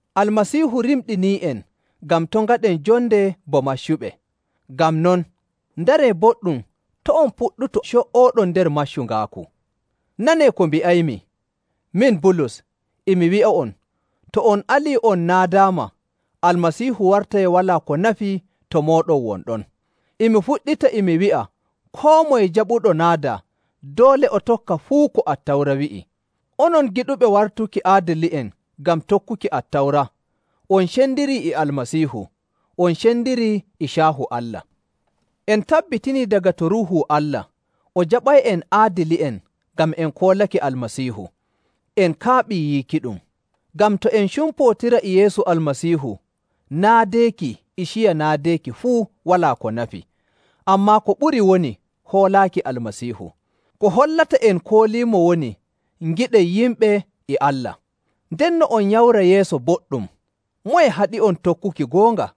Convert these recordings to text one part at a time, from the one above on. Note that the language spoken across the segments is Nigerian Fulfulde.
Almasiihu rimɗinii'en ngam to' ngaɗen jonde bo maccuɓe. Ngam non, ndaree boɗɗum to' on puɗɗutu co''ooɗon nder maccungaaku. Nanee ko mbi'aymi! Min Bulus, e mi wi'a'on, to on alii on naadaama, Almasiihu wartay walaa ko nafi to mooɗon won ɗon. E mi fuɗɗita e mi wi'a koo moye jaɓuɗo naadaa, doole o tokka fuu ko Attawra wi'i. Onon giɗuɓe wartuki aadili'en ngam tokkuki Attawra, on cendirii e Almasiihu, on cendirii e caahu Allah. En tabbitinii daga to Ruuhu Allah, o jaɓay'en en aadili'en ngam en koolake Almasiihu. En kaaɓii yiikiɗum. Ngam to en cumpootira e Yeesu Almasiihu, naadeeki e ciya naadeeki fuu walaa ko nafi. Ammaa ko ɓuri woni hoolaaki Almasiihu. Ko hollata en koolimo woni ngiɗen yimɓe e Allah. Ndenno on nyamra yeeso boɗɗum! Moye haɗi'on tokkuki goonga?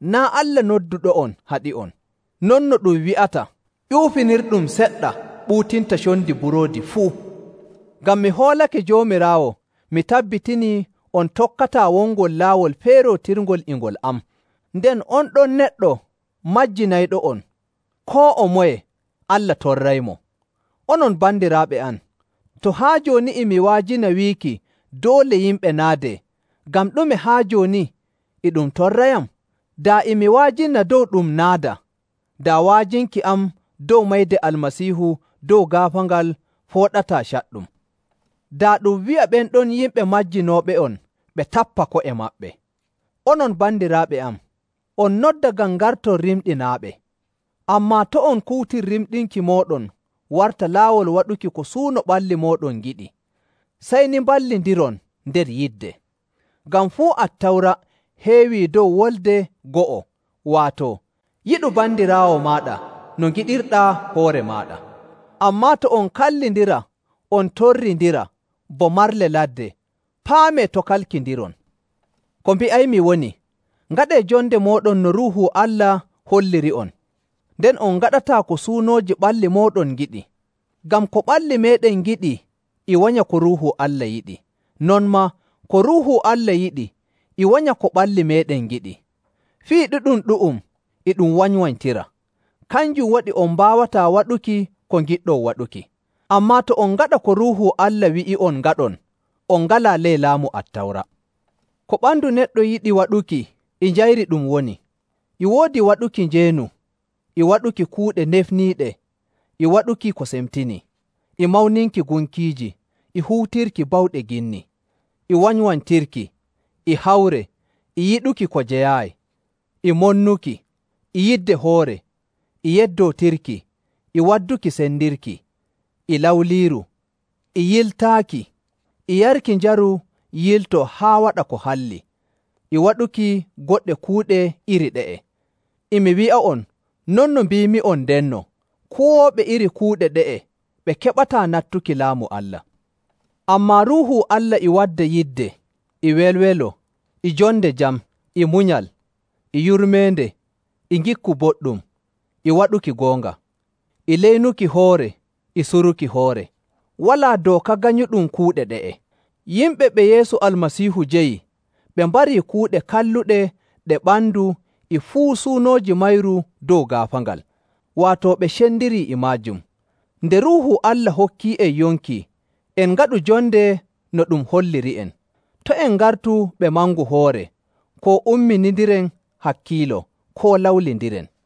Naa' Allah nodduɗo'on haɗi'on. Non no ɗum wi'ata, “Ƴuufinirɗum seɗɗa ɓuutinta condi buroodi fuu.” Ngam mi hoolake Joomiraawo, mi tabbitinii on tokkataa wongol laawol feerootirngol e ngol am. Nden on ɗon neɗɗo majjinayɗo'on, koo o moye, Allah torraymo. Onon bandiraaɓe am, to haa jooni e mi wa'ajina wiiki doole yimɓe naadee, ngam ɗume haa jooni e ɗum torrayam? Daa e mi wa'ajina dow ɗum naada, daa wa'ajinki am dow mayde Almasiihu dow gaafaangal fooɗataa caɗɗum. Daa ɗum wi'a ɓen ɗon yimɓe majjinooɓe'on ɓe tappa ko'e maɓɓe! Onon bandiraaɓe am, on nodda ngam ngarton rimɗinaaɓe. Ammaa to' on kuutir rimɗinki mooɗon warta laawol waɗuki ko suuno ɓalli mooɗon ngiɗi. Sey ni mballindiron nder yidde. Ngam fuu Attawra heewii dow wolde go'o, waato, “Yiɗu bandiraawo maaɗa no ngiɗirɗaa hoore maaɗa.” Ammaa to on kallindira on torrindira bo marle ladde, paamee to' kalkindiron. Ko mbi'aymi woni, ngaɗee jonde mooɗon no Ruuhu Allah holliri'on, nden on ngaɗataa ko suunooji ɓalli mooɗon ngiɗi. Ngam ko ɓalli meeɗen ngiɗi e wanya ko Ruuhu Allah yiɗi, non maa ko Ruuhu Allah yiɗi e wanya ko ɓalli meeɗen ngiɗi. Fii ɗiɗum ɗu'um e ɗum wanywanytira. Kanjum waɗi on mbaawataa waɗuki ko ngiɗɗon waɗuki. Ammaa to on ngaɗa ko Ruuhu Allah wi'i'on ngaɗon, on ngalaa ley laamu Attawra. Ko ɓandu neɗɗo yiɗi waɗuki, e njayri ɗum woni: e woodi waɗuki njeenu, e waɗuki kuuɗe nefniiɗe, e waɗuki ko semtinii, e mawninki gunkiiji, e huutirki bawɗe ginni, e wanywanytirki, e hawre, e yiɗuki ko jeyaayi, e monnuki, e yidde hoore, e yeddootirki, e wadduki sendirki, e lawliiru, e yiltaaki, e yarki njaru yiltoo haa waɗa ko halli, e waɗuki goɗɗe kuuɗe iri ɗe'e. E mi wi'a'on non no mbiimi'on ndenno, kuwooɓe iri kuuɗe ɗe'e ɓe keɓataa nattuki Laamu Allah. Ammaa Ruuhu Allah e wadda yidde, e welwelo, e jonde jam, e munyal, e yurmeende, e ngikku boɗɗum, e waɗuki goonga, e leynuki hoore, e suruki hoore. Walaa dooka ganyuɗum kuuɗe ɗe'e. Yimɓe ɓe Yeesu Almasiihu jeyi, ɓe mbarii kuuɗe kalluɗe ɗe ɓandu e fuu suunooji mayru dow gaafaangal, waato ɓe cendirii e maajum. Nde Ruuhu Allah hokki'en yonki, en ngaɗu jonde no ɗum holliri'en. To' en ngartu ɓe mangu hoore, koo umminindiren hakkiilo, koo lawlindiren.